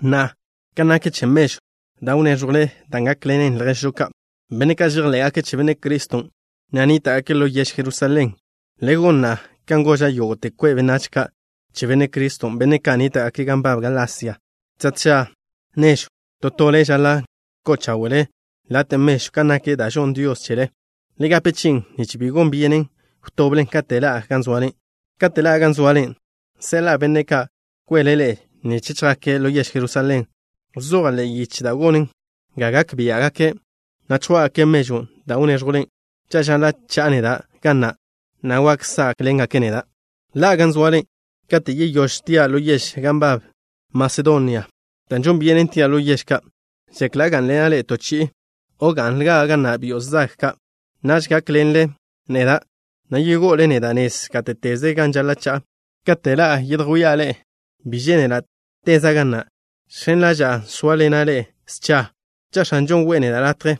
Na'a, kan nak che mežwn' da' wnéẕjwle dan' gákḻenen lježžo ka', benne' ka' žejḻé'gake' che Benne' Criston', na' nníta'gake' ḻo yež Jerusalén, le gon na'a kan goža' yógo'te kwe' benách ka' che Benne' Criston', benne' ka' nníta'gake' gan nbab Galasia. Tža tža nežw, to tole žaḻa' ko'o cháwe'le late' mežw, kan nak da' žonn Dios chele. Le gape chi'in, nich bi gon byenen wtoblen katen' ḻa'a gan zoale. Katen' ḻa'a gan zoale, seḻa'a benne' ka' kwele ḻe'e nich chjake' ḻo yež Jerusalén. Wzoja' ḻe'e yiche da' gonen ga gak biá'gake', na' chjwá'gake' mežwn' da' wnéẕjwlen. Cha' žaḻa' cha'a neda' ga na', na' wak sá'kḻene' neda'. Ḻa'a gan zoale kate' yeyóž tia' ḻo yež ka' gan nbab Masedonia, dan' žon byenen tia' ḻo yež ka'. Žekla' gá'nḻena' ḻe'e to chi'i, o ga'nlja' ga na' byo' zag ka'. Naž gak gákḻenle neda', na' yego'ole neda' nez gáte'teze gan žaḻa' cha'a. Kate' ḻa'a yedjwía' ḻe'e bi žénela' teza' ga na'. Žx̱en ḻaža'a sóaḻena' ḻe'e scha, cha' X̱anžon' we'e neda' latje.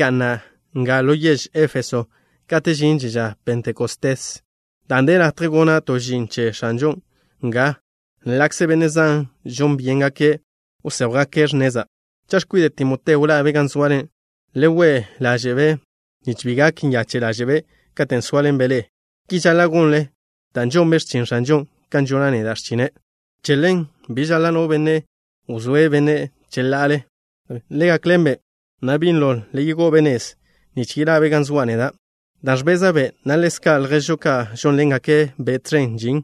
Ga'na' nga ḻo yež Éfeso kate' žinže ža Pentecostés, dan' de latje gona' to žin ẕen che X̱anžon' nga, ḻa'kze benne' zan žon byéngake' wséjwgake' x̱neza'. Cha' x̱kwide' Timoteo ḻa'be' gan zoale, le we' ḻaže'-be', nich bi gak nyache' ḻáže'be' katen' sóaḻenbe' ḻe'e. Ki žaḻa' gonle dan' žonbe' x̱chin X̱anžon' kan žona' neda' x̱chine'. Che ḻen, bi žaḻa' no benne' wzóe'-be' cheḻa'ale. Le gakḻen-be', na' binlo le yegó'o-be' nez, nich yeḻa'be' ga zoa' neda' ni, dan' ẕbeza'-be', na' ḻezka' lježžo ka' žónḻengake'-be' tẕen žin.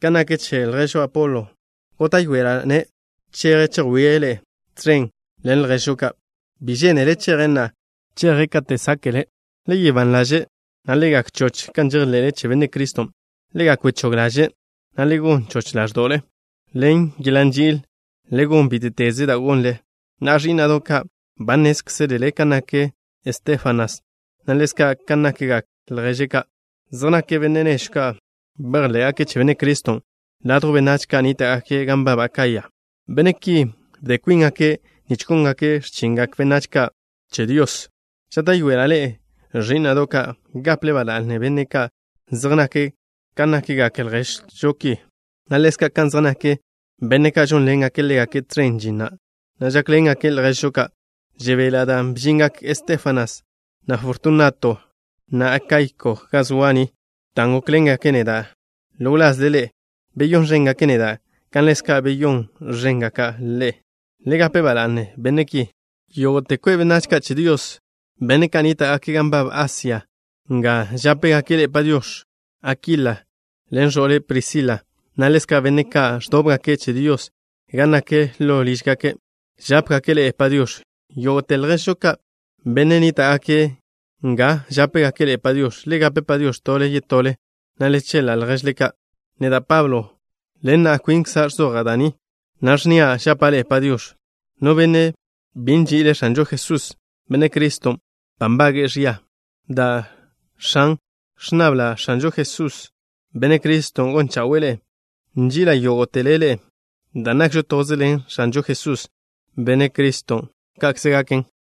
Kan nak che lježžo Apolo, góta'yoeḻe'ela'-ne' cheje' chejwíe' ḻe'e tẕen ḻen lježžo ka'. Bi žénele' cheje' na'a. Cheje' kate' sáke'le'. Le gak ban ḻaže', na' le gak choch kan žejḻe'le che Benne' Criston'. Le gak wechóg ḻaže', na' le gon choch ḻáẕdo'le. Ḻen yeḻa' nži'il le gon bíte'teze da' gonle. Na'a, ẕí'na'do' ka', ba nnézkzelele kan nak Estéfanas, na' ḻezka' kan nakgak lježe' ka'. Zej nake' benne' nežw ka' bejḻé'gake' che Benne' Criston' ladjw benách ka' nníta'gake' gan nbab Akaya. Benne' ki bde kwíngake' nich góngake' x̱chingak benách ka' che Dios. Žáta'yoela' ḻe'e, ẕí'na'do' ka', gaple ba la'ne benne' ka' zej nake' ka nakgak lježžo ki, na' ḻezka' kan zej nak benne' ka' žónḻengake' ḻégake' tẕen žin, na' žákḻengake' lježžo ka'. Žebela' dan' bžingak Estéfanas, na' Fortunato, na' Akaiko ga zoa' ni, dan' gókḻengake' neda' ḻo wlazle ḻe'e. Beyón ẕéngake' neda' kan ḻezka' beyón ẕéngake' ḻe'e. Le gape ba la'ne benne' ki. Yógo'te kwe' benách ka' che Dios, benne' ka' nníta'gake' gan nbab Asia nga žápegake' ḻe'e “Padiox̱.” Akila ḻen ẕo'le', Prisila, na' ḻezka' benne' ka' ẕdóbgake' che Dios gan nak ḻo lížgake', žápegake' ḻe'e “Padiox̱.” Yógo'te lježžo ka', benne' nníta'gake' nga žápegake' ḻe'e “Padiox̱.” Le gape “Padiox̱” tole yetole, na' le cheḻa' lježle ka'. Neda', Pablo, ḻen na' kwinkza' ẕzoja' da' ni, na' ẕnnia': žapa' ḻe'e “Padiox̱.” No benne' bi nži'ile' X̱anžo Jesús, Benne' Criston', ba nbage'e ẕia. Da, X̱an. Ẕnnabla' X̱anžo Jesús, Benne' Criston', gon chawe'e ḻe'e. Nži'ila' yógo'tele ḻe'e dan' nakžo toze ḻen X̱anžo Jesús, Benne' Criston'. Ka'kze gaken.